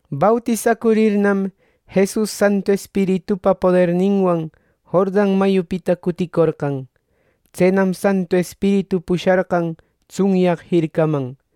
Bautisacurirnam Jesus Santu Espiritupa poderninwan Jordan mayupita cuticorqan. Tsenam Santu Espiritu pusharqan tsunyaq jircaman.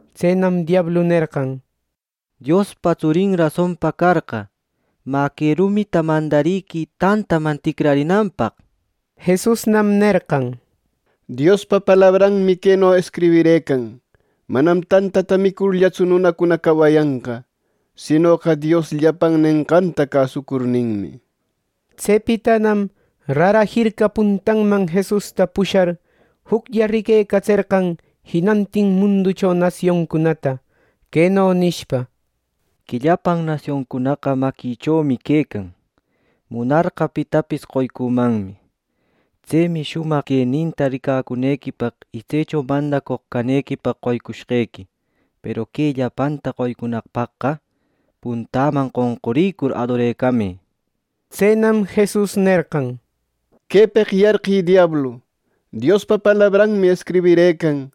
Tsenam diablu nerqan: —Diospa tsurin rasonpa carqa, mä que rumita mandariquï tantaman ticrarinanpaq, nir. Jesusnam nerqan: —Diospa palabranmi queno escribirëcan: ‘Manam tantata micurllatsu nunacuna cawayanqa; ˻sinoqa Dios llapan nenqanta cäsucurninmi˼’ —nir. Tsepitanam rara jirca puntanman Jesusta pushar, juclla riquecatserqan jinantin munducho nasioncunata, queno nishpa: —Que llapan nasioncunaqa maquïchomi quecan. Munarqa pitapis qoycümanmi. Tsemi shumaq queninta ricacunequipaq y tsecho mandacoq canequipaq qoycushqequi. Peru que llapanta qoycunaqpaqqa; puntäman qonqurïcur, adorecamë. Tsenam Jesus nerqan: ˻—¡Quepeq yarqï, diablu!˼ Diospa palabranmi escribirëcan: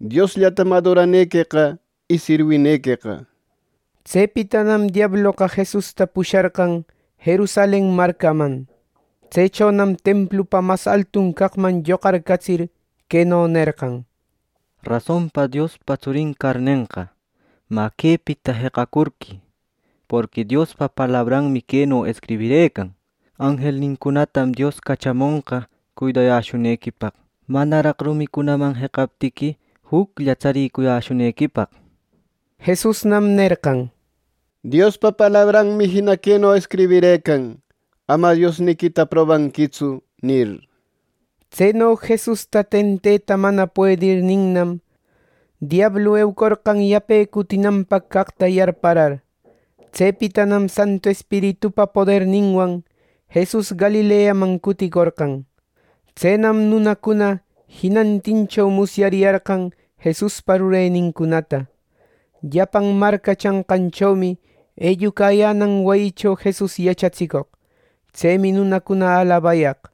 ‘Diosllatam adoranequeqa y sirwinequeqa’ nir. Tsepitanam diabloqa Jesusta pusharqan Jerusalen marcaman. Tsechonam templupa mas altun caqman lloqarcatsir, queno nerqan: —Rasonpa Diospa tsurin carnenqa, mä, quepita jeqacurquï. Porqui Diospa palabranmi queno escribirëcan: ‘Anjelnincunatam Dios cachamonqa cuidayäshunequipaq, manaraq rumicunaman jeqaptiqui juclla tsaricuyäshunequipaq’ nir. Jesusnam nerqan: —Diospa palabranmi jina queno escribirëcan: ‘Ama Diosniquita probanquitsu’ —nir. Tseno Jesusta tenteta mana puedirninnam, diablu eucorqan yape cutinanpaq caqta yarparar. Tsepitanam Santu Espiritupa poderninwan Jesus Galileaman cuticorqan. Tsenam nunacuna jinantincho musyariyarqan Jesuspa rurenincunata. Llapan marca chanqanchomi ellucayänan wayicho Jesus yachatsicoq. Tsemi nunacuna alabayaq.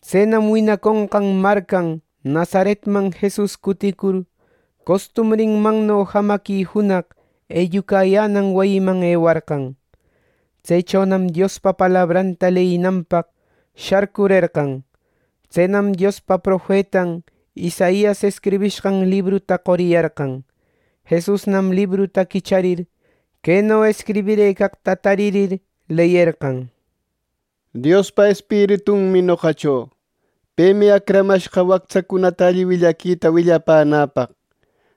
Tsenam winaconqan marcan Nazaretman Jesus cuticur, costumbrinmanno jamaqui junaq ellucayänan wayiman ewarqan. Tsechonam Diospa palabranta leyinanpaq sharcurerqan. Tsenam Diospa profetan Isaias escribishqan libruta qoriyarqan. Jesusnam libruta quicharir, queno escribirëcaqta taririr, leyerqan: “Diospa Espiritunmi noqacho. Pemi acramashqa wactsacunata alli willaquita willapänäpaq,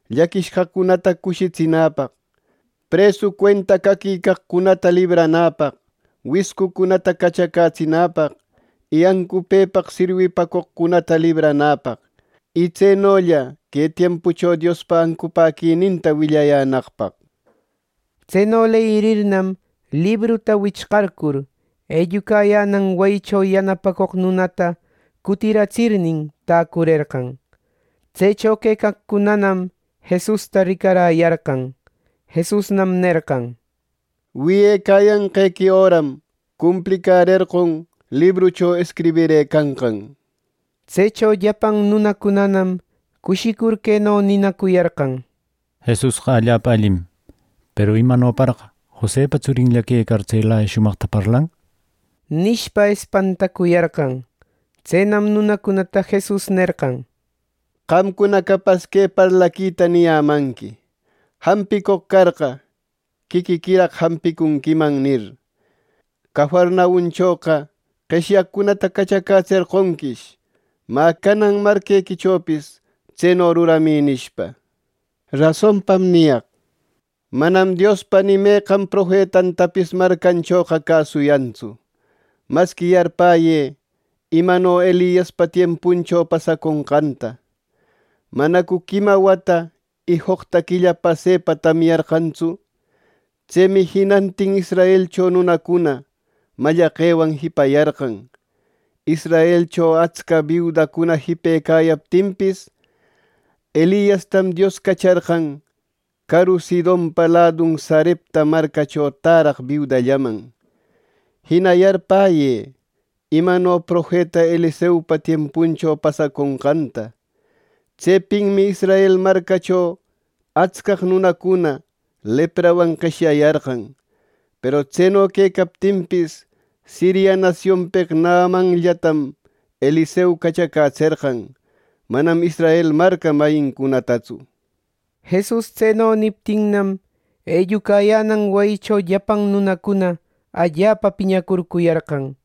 ˻llaquishqacunata cushitsinäpaq,˼ presu cuenta caquicaqcunata libranäpaq, wiscucunata cachacätsinäpaq, y ancupëpaq sirwipacoqcunata libranäpaq. Y tsenolla que tiempucho Diospa ancupäquininta willayänaqpaq.” Tseno leyirirnam, libruta wichqarcur, ellucayänan wayicho yanapacoq nunata cutiratsirnin, täcurerqan. Tsecho quecaqcunanam Jesusta ricaräyarqan. Jesusnam nerqan: —Wiyecayanqequi öram cumplicärerqon librucho escribirëcanqan. Tsecho llapan nunacunanam cushicur, queno ninacuyarqan: —Jesusqa allapa allim. Peru, ¡imanoraq Josepa tsurinlla quecar, tselaya shumaqta parlan! —nishpa, espantacuyarqan. Tsenam nunacunata Jesus nerqan: —Qamcuna capas que parlaquita niyämanqui: ‘Jampicoq carqa, quiquiquiraq jampicunquiman’ nir. ‘Cafarnaumchoqa qeshyaqcunata cachacätserqonquish. Mä, canan que marquequichopis tseno ruramï’ —nishpa. “Rasonpam niyaq: Manam Diospa ni meqan profetantapis marcanchoqa cäsuyantsu. Masqui yarpäyë imano Eliaspa tiempuncho pasaconqanta. ¿Manacu quima wata y joqta quilla pasepa tamyarqantsu? Tsemi jinantin Israelcho nunacuna mallaqewan jipayarqan. Israelcho atsca biudacuna jipecayaptinpis, Eliastam Dios cacharqan caru Sidonpa ladun Sarepta marcacho täraq biudallaman. Jina yarpäyë imano profeta Eliseopa tiempuncho pasaconqanta. Tsepinmi Israel marcancho atscaq nunacuna leprawan qeshyayarqan. Peru tseno quecaptinpis Siria nasionpeq Naamanllatam Eliseo cachacätserqan, manam Israel marca mayincunatatsu.” Jesus tseno niptinnam, ellucayänan wayicho llapan nunacuna allapa piñacurcuyarqan.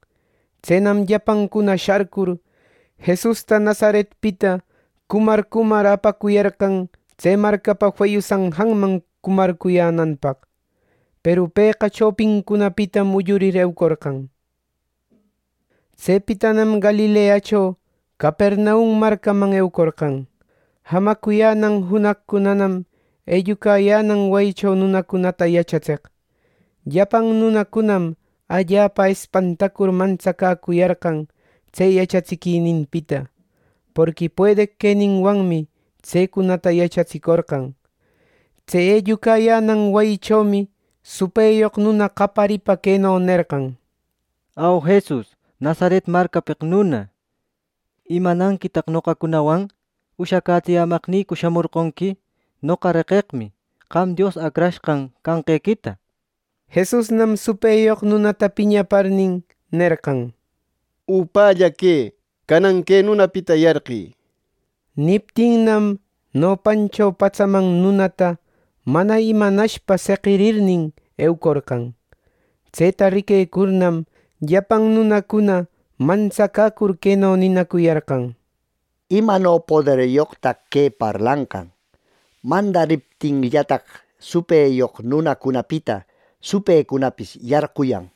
Tsenam llapancuna sharcur, Jesusta Nazaretpita cumar, cumar apacuyarqan tse marcapa feyu sanjanman cumarcuyänanpaq. Peru pëqa chopincunapitam ullurïcur, eucorqan. Tsepitanam Galileacho Capernaum marcaman eucorqan. Jamacuyänan junaqcunanam ellucayänan wayicho nunacunata yachatseq. Llapan nunacunam allapa espantacur mantsacäcuyarqan tse yachatsiquininpita, porqui puedeq queninwanmi tsecunata yachatsicorqan. Tse ellucayänan wayichomi supëyoq nuna qayaripa queno nerqan: —¡Au, Jesus Nazaret marcapeq nuna! ¿Imananquitaq noqacunawan? ¿Ushacätsiyämaqnïcu shamorqonqui? ¡Noqa reqeqmi, qam Dios Acrashqan canqequita! Jesusnam supëyoq nunata piñaparnin, nerqan: —¡Upälla quë! ¡Canan que nunapita yarqï! —nir. Niptinnam, nopancho patsaman nunata mana imanashpa seqirirnin, eucorqan. Tseta riquecurnam, llapan nunacuna mantsacäcur queno ninacuyarqan: —¡Imano poderyoqtaq que parlanqan! ¡Mandariptinllataq, supëyoq nunacunapita supëcunapis yarquyan!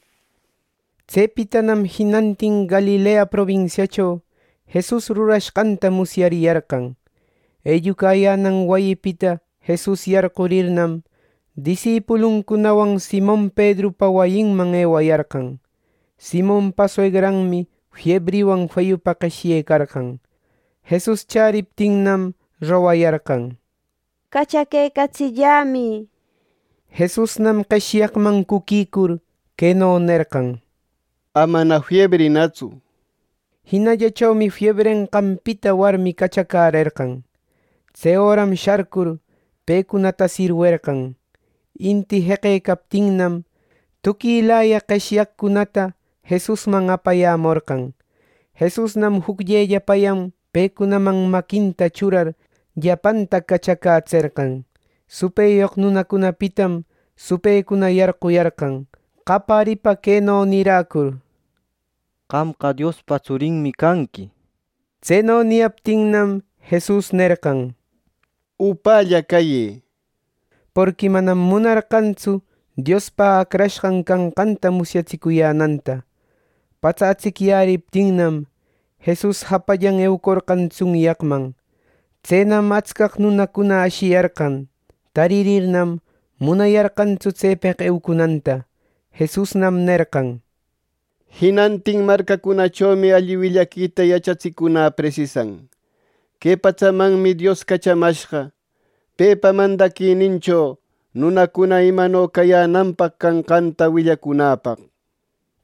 Tsepitanam jinantin Galilea probinsiacho Jesus rurashqanta musyariyarqan. Ellucayänan wayipita Jesus yarqurirnam, disipuluncunawan Simon Pedrupa wayinman ewayarqan. Simonpa suegranmi fiebriwan feyupa qeshyecarqan. Jesus chäriptinnam, rogayarqan: —¡Cachaquecatsillämï! —nishpa. Jesusnam qeshyaqman cuquicur, queno nerqan: —Amana fiebrïnatsu. Jinallachomi fiebrenqanpita warmi cachacärerqan. Tse öram sharcur, pecunata sirwerqan. Inti jeqecaptinnam, tuquilaya qeshyaqcunata Jesusman apayämorqan. Jesusnam jucllellapayan pecunaman maquinta churar, llapanta cachacätserqan. Supëyoq nunacunapitam supëcuna yarquyarqan qayaripa, queno niräcur: —¡Qamqa Diospa tsurinmi canqui! Tseno niyaptinnam, Jesus nerqan: —¡Upälla cayë! Porqui manam munarqantsu Diospa Acrashqan canqanta musyatsicuyänanta. Patsa atsicyäriptinnam, Jesus japallan eucorqan tsunyaqman. Tsenam atscaq nunacuna ashiyarqan. Taririrnam, munayarqantsu tsepeq eucunanta. Jesusnam nerqan: —Jinantin marcacunachomi alli willaquita yachatsicunä presisan. Que patsamanmi Dios cachamashqa, pepa mandaquinincho nunacuna imano cayänanpaq canqanta willacunäpaq.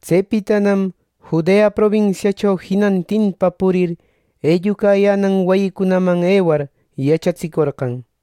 Tsepitanam Judea probinsiacho jinantinpa purir, ellucayänan wayicunaman ewar, yachatsicorqan.